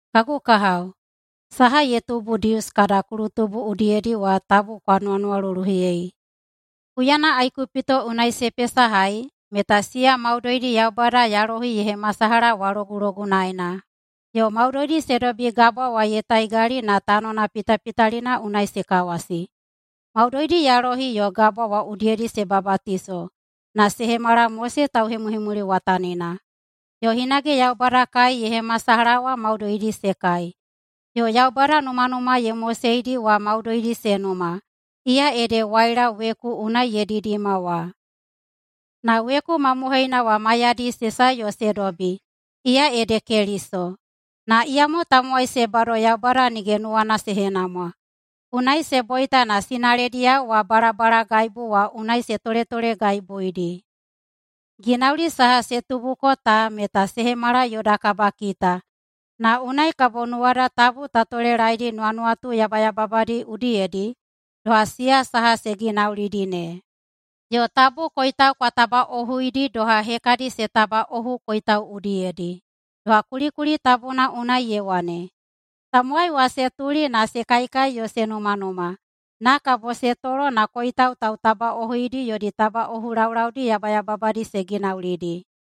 Kagu kahao, saha ye tubu Dius kada kulutubu udiyedi wa tabu kwa nuwanuwaluluhiyei. Huyana Aikupito unai se pesahai meta siya maudoidi Yaubada yalohi ye hemasalaha wa logulogunaena, yo maudoidi se dobi gabwa wa ye taigali na tanona pitapitalina unai se kawasi. Maudoidi yalohi yo gabwa wa udiyedi se babatiso na se hemala Mose tauhemuhemuliwatanina. Yo hinage Yaubada kai ye hemasalaha wa maudoidi se kai, yo Yaubada numanuma ye moseidi wa maudoidi se numa, iya ede waila weku unai ye didima wa. Na weku mamohoina wa maiyadi se sae yo se dobi, iya ede Keliso. Na iyamo tamowai se bado Yaubada nige nuwana se henamwa, unai se boita na sinalediyao wa balabalagaibu wa unai se toletolegaibuidi. Ginauli saha se tubuko ta meta se hemala yoda kabakita na unai kabo nuwada tabu ta tolelaedi nuwanuwatu yabayababadi udiyedi doha siya saha se ginaulidi ne. Yo tabu koitau kwa tabaꞌohuidi doha hekadi se tabaꞌohu koitau udiyedi. Doha kulikuli tabuna unai ye wane, “Tamowai wa se tuli na se kaikai yo se numanuma, na kabo se tolo na koitau tautabaꞌohuidi yodi tabaꞌohu laulaudi yabayababadi se ginaulidi.”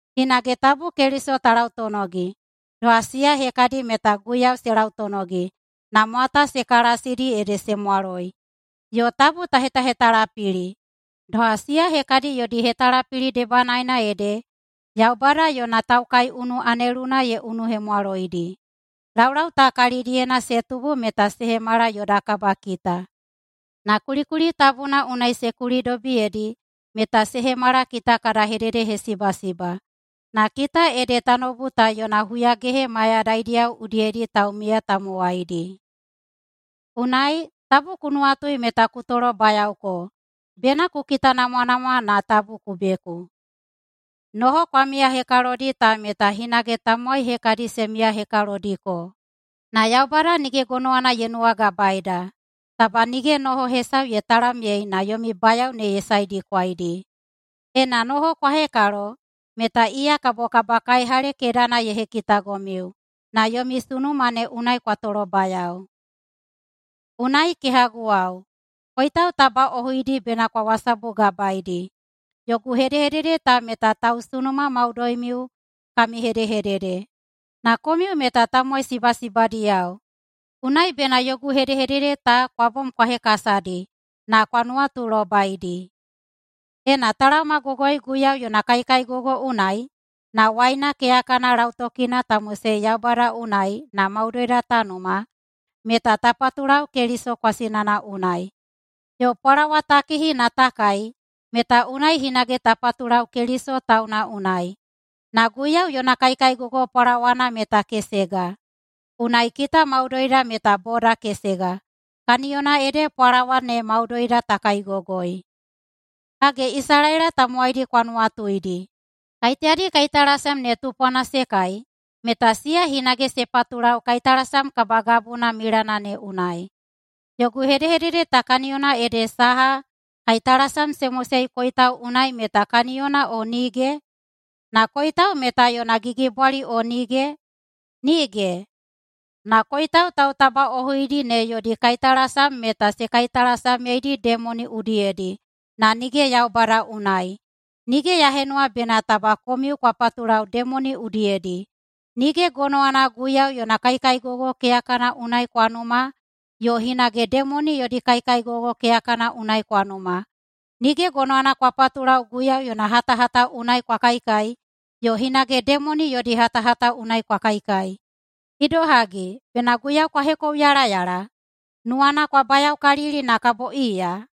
Hinage tabu Keliso ta lautonogi doha siya hekadi meta Guiyau se lautonogi na mwata se kalasidi ede se mwaloi. Yo tabu ta hetahetalapili, doha siya hekadi yodi hetalapili debanaena ede Yaubada yona taukaiunu aneluna ye unuhemwaloidi. Laulau ta kalidiyena se tubu meta se hemala yoda kabakita. Na kulikuli tabuna unai se kulidobiyedi meta se hemala kita kada hededehesibasiba, na kita ede tanoubu ta yona huyagehe mayadaidiyao udiyedi taumiya tamowaidi. Unai, taba ku nuwatui meta ku tolobayaoko, bena ku kitanamwanamwa tabu ku beku. Noho kwa miyahekalodi ta meta hinage tamowai hekadi se miyahekalodiko. Na Yaubada nige gonowana ye nuwagabaeda. Taba nige noho hesau ye talamyei na yomi bayao ne ye saedikwaidi. Ena noho kwa hekalo meta iya kabo kabakaihale kedana ye hekitagomiu na yomi sunuma ne unai kwa tolobayao. Unai, kehaguwao, koitau tabaꞌohuidi bena kwa wasabugabaeidi. Yogu hedehedede ta meta tausunuma maudoimiu kami hedehedede, na komiu meta tamowai sibasibadiyao. Unai bena yogu hedehedede ta kwa bom kwa hekasadi na kwa nuwatulobaidi. Ena ta laomagogoi Guiyau yona kaikaigogo unai, na waina keyakana lautokina ta mosei Yaubada unai na maudoida ta numa, meta ta patulau Keliso kwasinana unai. Yo pwalawa ta kihi na ta kai meta unai hinage ta patulau Keliso tauna unai. Na Guiyau yona kaikaigogo pwalawana meta kesega, unai kita maudoida meta boda kesega, kaniyona ede pwalawa ne maudoida ta kaigogoi. Hage, Isalaela tamowaidi kwa nuwatuidi. Kaiteyadi kaitalasam ne tupwana se kai, meta siya hinage se patulau kaitalasam kabagabuna milana ne unai. Yogu hedehedede ta kaniyona ede saha, kaitalasam se mosei koitau unai meta kaniyona o nige? Na koitau meta yona gigibwali o nige? Nige! Na koitau tautabaꞌohuidi ne yodi kaitalasam meta se kaitalasamyeidi demoni udiyedi na nige Yaubada unai. Nige ya henuwa bena taba komiu kwa patulau demoni udiyedi. Nige gonowana Guiyau yona kaikaigogo keyakana unai kwa numa, yo hinage demoni yodi kaikaigogo keyakana unai kwa numa. Nige gonowana kwa patulau Guiyau yona hatahata unai kwa kaikai, yo hinage demoni yodi hatahata unai kwa kaikai. Idohagi, bena Guiyau kwa hekouyalayala? Nuwana kwa bayaokalili na kabo iya?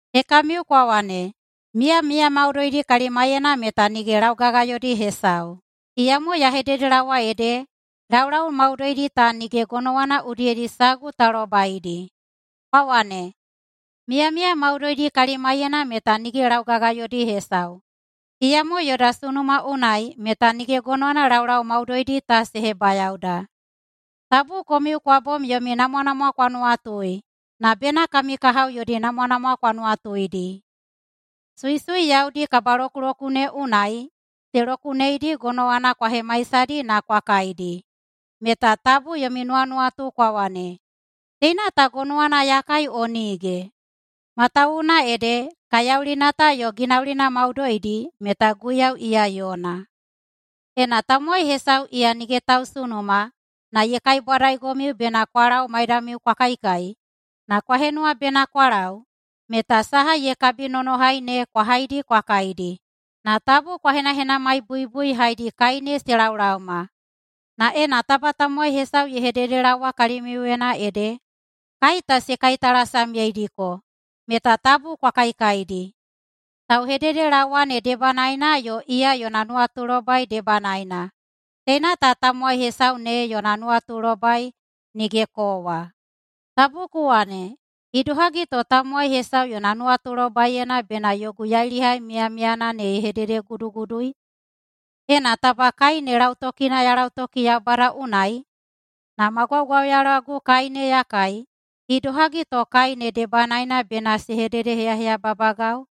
Hekamiu kwa wane, “Miyamiya maudoidi kalimaiyena meta nige laugagayodi hesau.” Iyamo ya hededelaowa ede, laulau maudoidi ta nige gonowana udiyedi sagu ta lobaidi. Kwa wane, “Miyamiya maudoidi kalimaiyena meta nige laugagayodi hesau.” Iyamo yoda sunuma unai meta nige gonowana laulau maudoidi ta se hebayaoda. Tabu komiu kwa bom yomi namwanamwa kwa nuwatui, na bena kami kahao yodi namwanamwa kwa nuwatuidi. Suisui yaudi kabalokulokune unai se lokuneidi gonowana kwa hemaisadi na kwa kaidi, meta tabu yomi nuwanuwatuyena kwa wane, “Teina ta gonowana ya kai o nige?” Matawuwuna ede, “kaiyaulina ta yo ginaulina maudoidi meta Guiyau iya yona.” Ena tamowai hesau iya nige tausunuma na ye kaibwadaigomiu bena kwa lau maidamiu kwa kaikai, na kwa henuwa bena kwa lau, meta saha ye kabinonohai ne kwa haidi kwa kaidi, na tabu kwa henahenamaibuibui haedi kai ta se laolaoma. Na ena taba tamowai hesau ye hededelaowa kalimiuyena ede, “Kai ta se kaitalasamyeidiko!”, meta tabu kwa kaikaidi, tauhededelaowa ne debanaena yo iya yona nuwatulobai debanaena. Teina ta tamowai hesau ne yona nuwatulobai, nige kowa. Taba ku wane, “Idohagi to tamowai hesau yona nuwatulobaiyena bena yogu yailihai miyamiyana ye hededegudugudui? Ena taba kai ne lautokina ya lautoki Yaubada unai na ma gwaugwauyalagu kai ne ya kai, idohagi to kai ne debanaena bena se hededeheyaheyababagau?”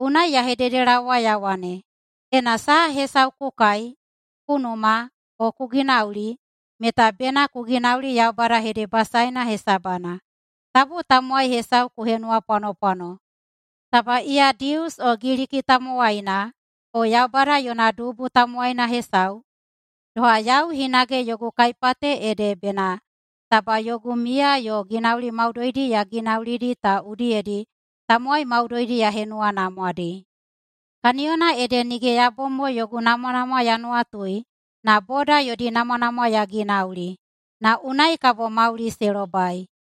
Unai ya hededelaowa ya wane, ena saha hesau ku kai, ku numa, o ku ginauli, meta bena ku ginauli Yaubada hedebasaeina hesabana. Tabu tamowai hesau ku henuwapwanopwano, taba iya Dius o Giliki tamowaina, o Yaubada yona dubu tamowaina hesau, doha yau hinage yogu kaipate ede bena taba yogu miya yo ginauli maudoidi ya ginaulidi ta udiyedi tamowai maudoidi ya henuwanamwadi. Kaniyona ede nige ya bom mo yogu namwanamwa ya nuwatui, na boda yodi namwanamwa ya ginauli, na unai kabo mauli se lobai.